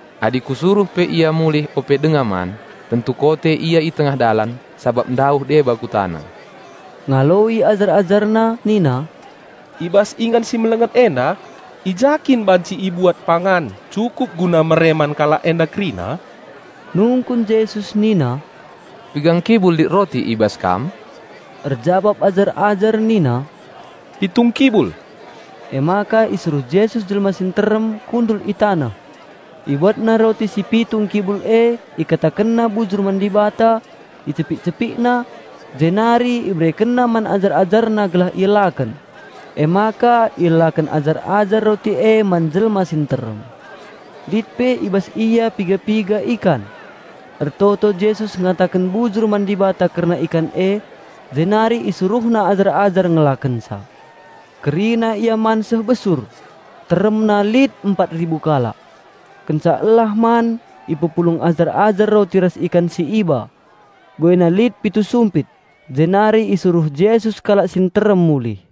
Adi Kusuruh pe ia mulih ope denga man, tentu kote ia i tengah dalan, sabap ndauh deba kutana." Ngaloi ajar-AjarNa nina, "I bas ingan si melenget enda, i ja kin banci ibuat pangan cukup guna mere man kalak enda kerina?" Nungkun Jesus nina, "Piga ngkibul lit roti i bas kam?" Erjabap ajar-ajar nina, "Pitu ngkibul." Emaka isuruh Jesus jelma si nterem kundul i taneh. IbuatNa roti si pitu ngkibul e, IkatakenNa bujur man Dibata, icepik-CepikNa, jenari IberekenNa man ajar-AjarNa gelah ielaken. Emaka ielaken ajar-ajar roti e man jelma si nterem. Lit pe i bas ia piga-piga ikan. Ertoto Jesus ngataken bujur man Dibata kerna ikan e, jenari IsuruhNa ajar-ajar ngelakenca. Kerina ia man seh besur. Teremna lit empat ribu kalak. Kenca elah man ipepulung ajar-ajar roti ras ikan si iba, buena lit pitu sumpit. Jenari isuruh Jesus kalak si nterem mulih.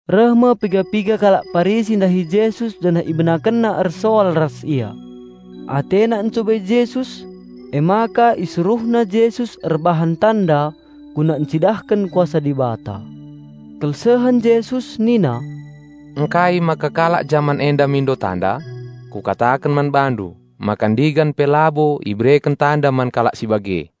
Reh me piga-piga kalak Parisi ndahi Jesus janah ibenakenna ersoal ras Ia. Atena encubai Jesus, emaka isuruhna Jesus erbahan tanda guna encidahken kuasa Dibata. Kelsehen Jesus nina, "Ngkai maka kalak jaman enda mindo tanda? Kukataken man bandu maka ndigan pe labo ibereken tanda man kalak si bage."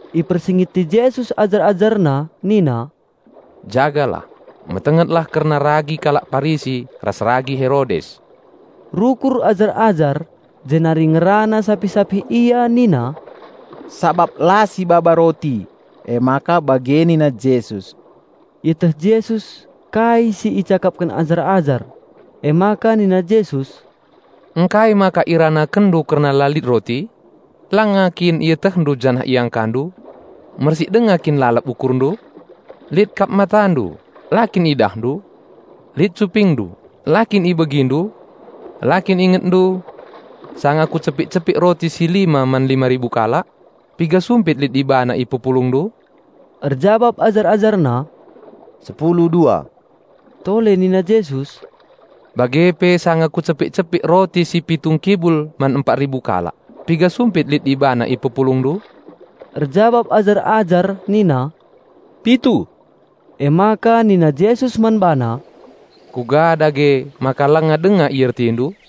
Ipersingeti Jesus ajar-AjarNa nina, "Jagalah, metengetlah kerna ragi kalak Parisi ras ragi Herodes." Rukur ajar-ajar jenari ngerana sapih-sapih ia nina, "Sabap la sibaba roti, emaka bage nina Jesus." Ieteh Jesus kai si icakapken ajar-ajar. Emaka nina Jesus, "Ngkai maka iranakenndu kerna la lit roti? Langa kin ietehndu janah iangkandu? Mersik denga kin lalap ukurndu? Lit kap matandu la kin idahndu? Lit cupingndu, la kin ibegindu? La kin ingetndu, sanga Kucepik-cepik roti si lima man lima ribu kalak? Piga sumpit lit ibana ipepulungndu?" Erjabap ajar-AjarNa, "Sepulu dua." Tole nina Jesus, "Bage pe sanga Kucepik-cepik roti si pitu ngkibul man empat ribu kalak, piga sumpit lit ibana ipepulungndu?" Erjabap ajar-ajar nina, "Pitu." Emaka nina Jesus man bana, "Kuga dage maka langa denga iertindu?"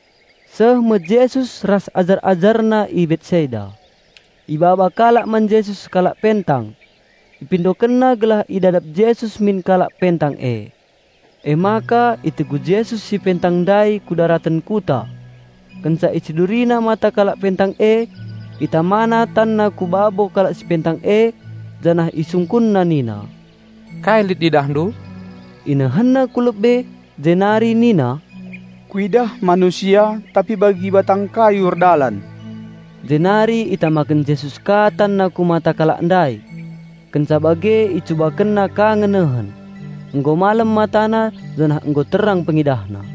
Seh me Jesus ras ajar-AjarNa i Betsaida. Ibaba kalak man Jesus sekalak pentang. Ipindokenna gelah idadap Jesus min kalak pentang e. Emaka itegu Jesus si pentang ndai ku daraten kuta. Kenca IciduriNa mata kalak pentang e, ItamaNa TanNa ku babo kalak si pentang e janah IsungkunNa nina, "Kai lit idahndu?" Inehenna ku lebe, jenari nina, "Kuidah manusia, tapi bagi batang kayu erdalan." Jenari itamakenna Jesus ka TanNa ku mata kalak ndai. Kenca bage icubakenna ka ngenehen. Nggo malem matana, janah nggo terang pengidahna.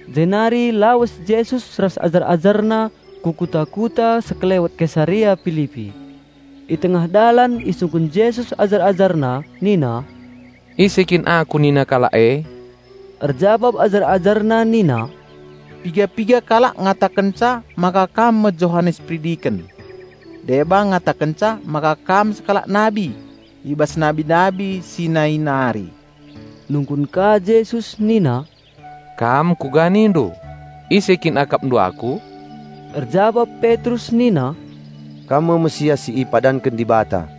Jenari lawes Jesus ras ajar-AjarNa ku kuta-kuta sekelewet Kesarea Pilipi. I tengah dalan isungkun Jesus ajar-AjarNa nina, "Ise kin aku nina kalak e?" Erjabap ajar-AjarNa nina, "Piga-piga kalak ngatakenca maka Kam me Johanes Peridiken. Deba ngatakenca maka Kam sekalak nabi i bas nabi-nabi si nai nari." Nungkun ka Jesus nina, "Kam kuga nindu? Ise kin akapndu Aku?" Erjabap Petrus nina, "Kam me Raja Penampat si ipadanken Dibata."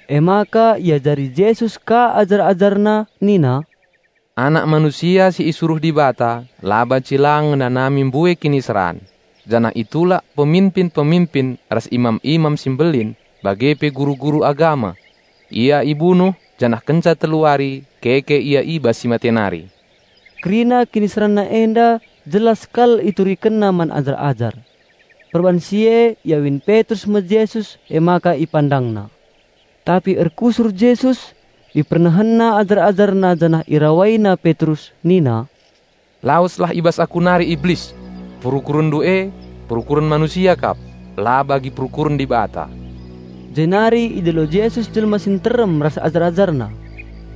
Emaka iajari Jesus ka ajar-AjarNa nina, "Anak Manusia si isuruh Dibata la banci lang ngenanami mbue kiniseran, janah itulak peminpin-peminpin ras imam-imam si mbelin bage pe guru-guru agama. Ia ibunuh janah kenca telu wari nggeluh Ia mulihi." Kerina KiniseranNa enda jelas kal IturikenNa man ajar-ajar. Perban si e iawin Petrus me Jesus emaka ipandangna. Tapi erkusur Jesus, IpernehenNa ajar-AjarNa janah IrawaiNa Petrus nina, "Laweslah i bas Aku nari, Iblis! Perukurenndu e, perukuren manusia kap, la bagi perukuren Dibata." Jenari idilo Jesus jelma si nterem ras ajar-AjarNa.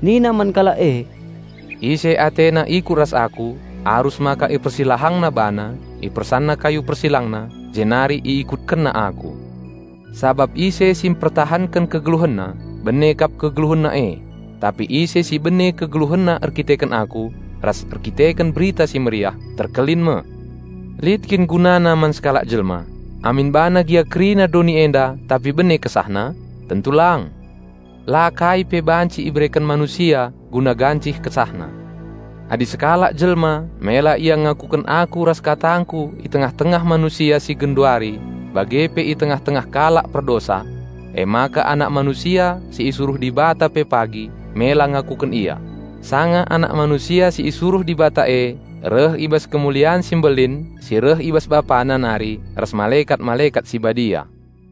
Nina man kalak e, "Ise atena ikut ras Aku, arus maka ipersilahangna bana, ipersanna kayu persilangna jenari iikutkenna Aku. Sabap ise si mpertahanken kegeluhenna, bene kep kegeluhenna e, tapi ise si bene kegeluhenna erkiteken Aku ras erkiteken Berita.Ssi Mehuli, terkelin me. Lit kin gunana man sekalak jelma, amin bana gia kerina doni enda tapi bene kesahna? Tentu lang! La kai pe banci ibereken manusia guna gancih kesahna. Adi sekalak jelma mela ia ngakuken Aku ras KatangKu i tengah-tengah manusia si genduari bage pe i tengah-tengah kalak perdosa, emaka Anak Manusia si isuruh Dibata pe pagi mela ngakuken ia, sanga Anak Manusia si isuruh Dibata e reh i bas kemulian si mbelin si reh i bas Bapana nari ras malekat-malekat si badia."